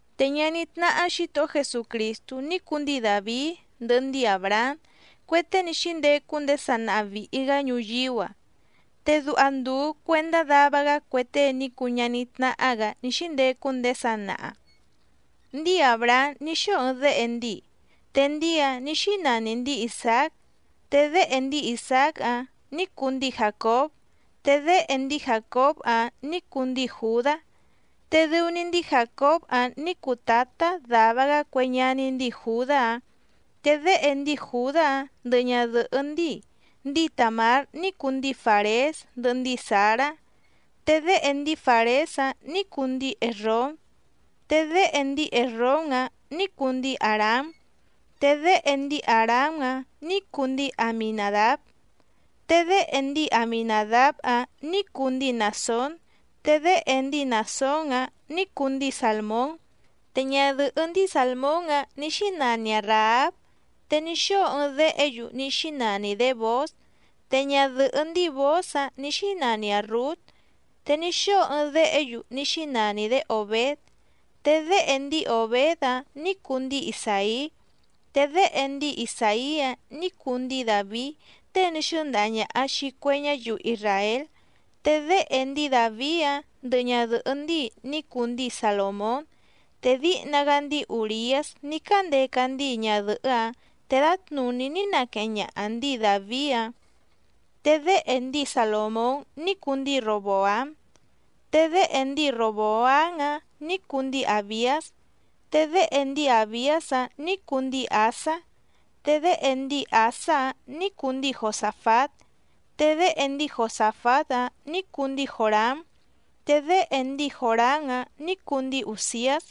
Te ñaní tnáhá Xǐtohó Jesucrìstú ní cuu ndíi Dàvií ndɨhɨ ndíi Àbrahám, cue tée ní xíndecu ndéé sanaha vìhi‑gá ñuyíú‑a. Te duha ndùu cuendá dava‑gá cue tée ní cuu ñaní tnáhá‑gǎ ní xíndecu ndéé sanaha. Ndíi Àbrahám ní xóo ɨɨⁿ déhe ndíi, te ndíi‑áⁿ nǐ xínani ndǐi Isàác. Te déhe ndíi Isàác‑áⁿ nǐ cuu ndíi Jàcób, te déhe ndíi Jàcób‑áⁿ nǐ cuu ndíi Jùdá, te dɨu‑ni ndíi Jàcób‑áⁿ nǐ cuu tǎtá dava‑gá cue ñaní ndíi Jùdá‑áⁿ. Te déhe ndíi Jùdá‑áⁿ ndɨhɨ ñadɨ̀hɨ́ ndíi, ndíi Tàmár ní cuu ndíi Fàrés ndɨhɨ ndíi Zàrá. Te déhe ndíi Fàrés‑áⁿ nǐ cuu ndíi Èsróm, te déhe ndíi Èsróm‑áⁿ nǐ cuu ndíi Àrám. Te déhe ndíi Àrám‑áⁿ nǐ cuu ndíi Aminàdáb, te déhe ndíi Aminàdáb‑áⁿ nǐ cuu ndíi Nàsón, te déhe ndíi Nàsón‑áⁿ nǐ cuu ndíi Sàlmón. Te ñadɨ̀hɨ́ ndíi Sàlmón‑áⁿ nǐ xínani‑aⁿ Ràháb, te ní xóo ɨɨⁿ déhe‑yu ní xínani‑dě Bòóz. Te ñadɨ̀hɨ́ ndíi Bòóz‑áⁿ nǐ xínani‑aⁿ Rǔt, te ní xóo ɨɨⁿ déhe‑yu ní xínani‑dě Òbéd, te déhe ndíi Òbéd‑áⁿ nǐ cuu ndíi Isàí. Te déhe ndíi Isàí‑áⁿ nǐ cuu ndíi Dàvií tée ní xɨ́ndaha ñàha xii cue ñáyiu isràél. Te déhe ndíi Dàvií‑áⁿ ndɨhɨ ñadɨ̀hɨ́ ndíi ní cuu ndíi Salòmón. Te díhna‑gá ndíi Ùriás ní cándeca ndíi ñadɨ̀hɨ́‑áⁿ te dǎtnùní ní naqueheⁿ ñaha ndǐi Dàvií‑áⁿ. Te déhe ndíi Salòmón ní cuu ndíi Ròboám, te déhe ndíi Ròboám‑áⁿ nǐ cuu ndíi Àbiás, te déhe ndíi Àbiás‑áⁿ nǐ cuu ndíi Àsá. Te déhe ndíi Àsá‑áⁿ nǐ cuu ndíi Josàfát, te déhe ndíi Josàfát‑áⁿ nǐ cuu ndíi Jòrám, te déhe ndíi Jòrám‑áⁿ nǐ cuu ndíi Ùziás.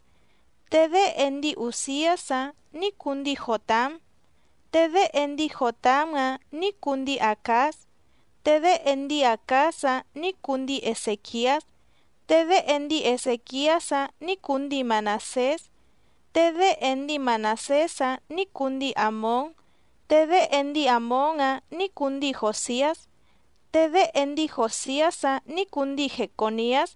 Te déhe ndíi Ùziás‑áⁿ nǐ cuu ndíi Jòtám, te déhe ndíi Jòtám‑áⁿ nǐ cuu ndíi Àcáz, te déhe ndíi Àcáz‑áⁿ nǐ cuu ndíi Ezèquiás. Te déhe ndíi Ezèquiás‑áⁿ nǐ cuu ndíi Manàsés, te déhe ndíi Manàsés‑áⁿ nǐ cuu ndíi Àmón, te déhe ndíi Àmón‑áⁿ nǐ cuu ndíi Jòsiás. Te déhe ndíi Jòsiás‑áⁿ nǐ cuu ndíi Jecòniás.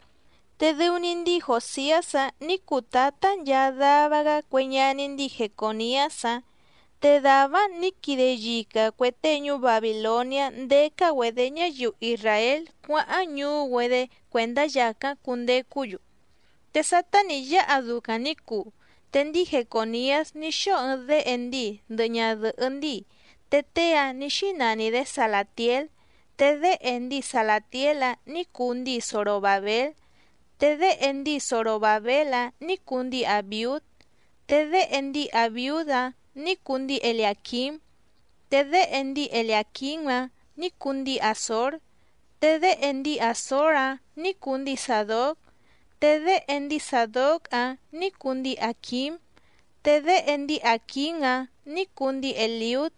Te dɨu‑ni ndíi Jòsiás‑áⁿ nǐ cuu tǎtá nchaa dava‑gá cue ñaní ndíi Jecòniás‑áⁿ. Te dàvá‑áⁿ nǐ quide yica cuè tée ñuú Babìloniá ndécá‑güedě ñáyiu isràél cuáháⁿ ñuú‑güedé cuèndá yàcáⁿ cundecú‑yu. Te sátá nǐ yáha ducaⁿ nǐ cuu, te ndíi Jecòniás ní xóo ɨɨⁿ déhe ndíi ndɨhɨ ñadɨ̀hɨ́ ndíi, te tée‑áⁿ nǐ xínani‑dě Salàtiél. Te déhe ndíi Salàtiél‑áⁿ nǐ cuu ndíi Zorobàbél. Te déhe ndíi Zorobàbél‑áⁿ nǐ cuu ndíi Àbiúd, te déhe ndíi Àbiúd‑áⁿ nǐ cuu ndíi Eliàquím, te déhe ndíi Eliàquím‑áⁿ nǐ cuu ndíi Àzór. Te déhe ndíi Àzór‑áⁿ nǐ cuu ndíi Sàdóc, te déhe ndíi Sàdóc‑áⁿ nǐ cuu ndíi Àquím, te déhe ndíi Àquím‑áⁿ nǐ cuu ndíi Èliúd.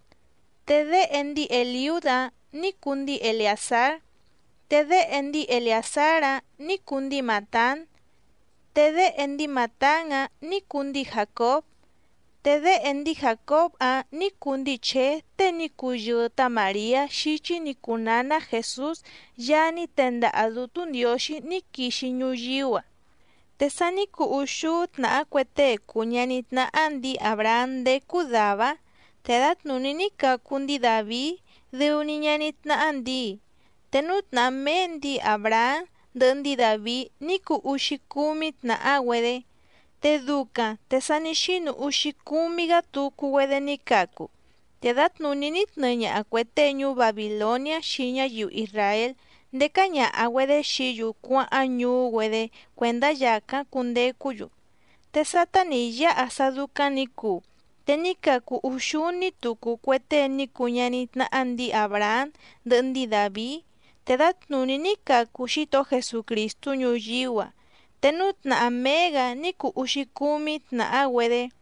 Te déhe ndíi Èliúd‑áⁿ nǐ cuu ndíi Eleàzár, te déhe ndíi Eleàzár‑áⁿ nǐ cuu ndíi Màtán, te déhe ndíi Màtán‑áⁿ nǐ cuu ndíi Jàcób. Te déhe ndíi Jàcób‑áⁿ nǐ cuu ndíi Chèé tée ní cuu yɨɨ tá Màriá xíchí nǐ cuu nǎná Jèsús Yaá ní tendaha Dǔtú Ndiǒxí ní quixi ñuyíú‑a. Te sa ní cuu úxúú tnàhá cue tée cùu ñaní tnáhá ndǐi Àbrahám ndécú dàvá‑áⁿ, te dǎtnùní ní cacu ndíi Dàvií dɨu‑ni ñaní tnáhá ndǐi. Te núú tnàhá méé ndǐi Àbrahám ndɨhɨ ndíi Dàvií ní cuu úxícúmí tnàhá‑güedé. Te ducaⁿ te sa ní xínu úxícúmí‑gǎ tucu‑güedé ní cacu, te dǎtnùní ní tnɨɨ ñaha cuè tée ñuú Babìloniá xii ñáyiu isràél ndécá ñàha‑güedé xií‑yu cuáháⁿ ñuú‑güedé cuèndá yàcáⁿ cundecú‑yu. Te sátá nǐ yáha sá dúcáⁿ nǐ cuu, te ní cacu úxúní tucu cue tée ní cuu ñaní tnáhá ndǐi Àbrahám ndɨhɨ ndíi Dàvií, te dǎtnùní ní cacu Xítohó Jesucrìstú ñuyíú‑a. Te núú tnàhá méé‑gǎ ní cuu úxícúmí tnàhá‑güedé.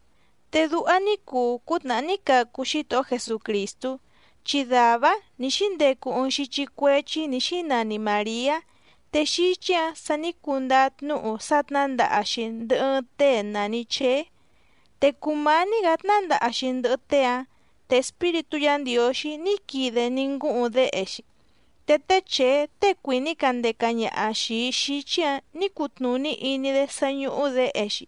Te duha ní cuu cútnàhá ní cacu Xítohó Jesucrìstú, chi dàvá‑áⁿ nǐ xíndecu ɨɨⁿ xíchí cuéchí nǐ xínani Màriá. Te xíchí‑ǎⁿ sa ní cundáá tnúhu sá tnǎndaha‑xi ndɨhɨ ɨɨⁿ tée nàni Cheé. Te cùmání‑gǎ tnándaha‑xi ndɨhɨ tée‑áⁿ te Espíritú Yǎ Ndiǒxí ní quide ní ngúhuⁿ déhe‑xi. Te té Chèé tée cuìní candeca ñaha xìi xíchí‑ǎⁿ nǐ cutnùní iní‑dé sá ñúhú děhe‑xi.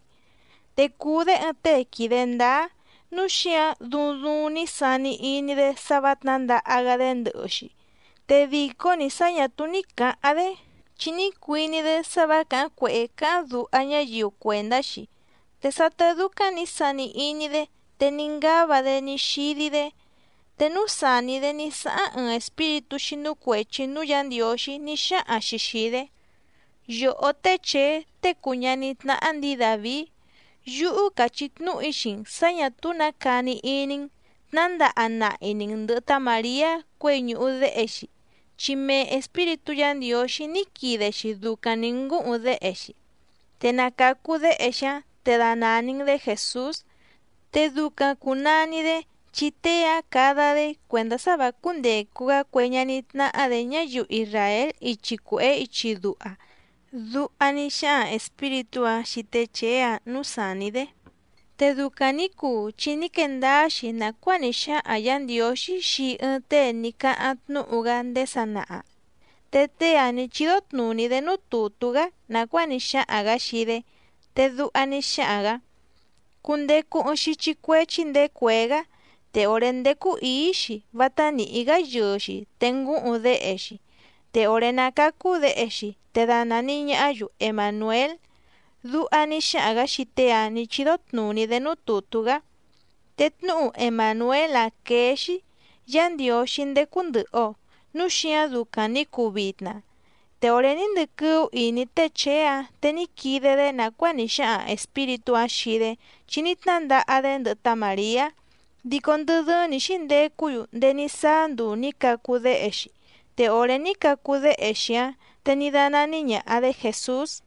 Te cùu‑dé ɨɨⁿ tée quìde ndáá, núu xíǎⁿ duuⁿ duuⁿ ní sani iní‑dé sá vǎ tnǎndaha‑gá‑dé ndɨhɨ‑xi, te dìcó‑ni sá ñà túú ní cǎháⁿ‑dé chi ní cuiní‑dé sá vǎ càháⁿ cuèhé cáháⁿ duha ñáyiu cuèndá‑xi. Te sátá dúcáⁿ nǐ sani iní‑dé te ní ngáva‑dé ní xídí‑dé, te núú sàní‑dé ní sáháⁿ ɨɨⁿ espíritú xínú cuèchi núú Yǎ Ndiǒxí ní xáhaⁿ‑xi xìi‑dé: —Yòhó té Chèé tée cùu ñaní tnáhá ndǐi Dàvií, yúhú càchí tnúhu‑í xii‑n sǎ ñà túú nǎ cani iní‑n, tnǎndaha nahi‑ni‑n ndɨ̀hɨ tá Màriá cuěi ñùhu déhe‑xi, chi mee Espíritú Yǎ Ndiǒxí ní quide‑xi ducaⁿ nǐ ngúhuⁿ déhe‑xi. Te na càcu déhe‑xi‑áⁿ te danàni‑n‑dé Jèsús. Te ducaⁿ cùnani‑dé, chi tée‑áⁿ cada‑dé cuèndá sá vǎ cúndècu‑gá cue ñaní tnáhá‑dě ñáyiu isràél ichi cuèhé ichi duha —duha ní xáhaⁿ espíritú‑áⁿ xii té Chèé‑áⁿ nǔú sàní‑dé. Te ducaⁿ nǐ cuu chi ní quee ndáá‑xi nàcuáa ní xáhaⁿ Yǎ Ndiǒxí xii ɨɨⁿ tée ní cáháⁿ tnúhu‑gá ndéé sanaha. Te tée‑áⁿ nǐ chídó tnùní‑dé núú tùtú‑gá nàcuáa ní xáhaⁿ‑gǎ xii‑dé, te duha ní xáhaⁿ‑gǎ: Cundecu ɨɨⁿ xíchí cuéchí ndèé cuèé‑gá. Te òré ndécú ǐí‑xi vátá nìhí‑gá yɨɨ‑xi te ngúhuⁿ déhe‑xi. Te òré ná cácú děhe‑xi te danàni ñahá‑yu Emànuél. Duha ní xáhaⁿ‑gǎ xii tée‑áⁿ nǐ chídó tnùní‑dé núú tùtú‑gá. Te tnúhu Emànuél‑áⁿ quéé‑xí: Yá Ndiǒxí ndécú ndɨ̀hɨ‑o. Núu xíǎⁿ ducaⁿ nǐ cuu vitna. Te òré ní ndɨquɨ́ú ìní té Chèé‑áⁿ te ní quide‑dé nàcuáa ní xáhaⁿ espíritú‑áⁿ xii‑dé chi ní tnándaha‑dé ndɨhɨ tá Màriá. Dico ndɨ dɨ́ɨ́ⁿ nǐ xíndecú‑yu ndéé ní sáá nduu nǐ cacu déhe‑xi. Te òré ní cacu déhe‑xi‑áⁿ te ní dánání ñàha‑dé Jèsús.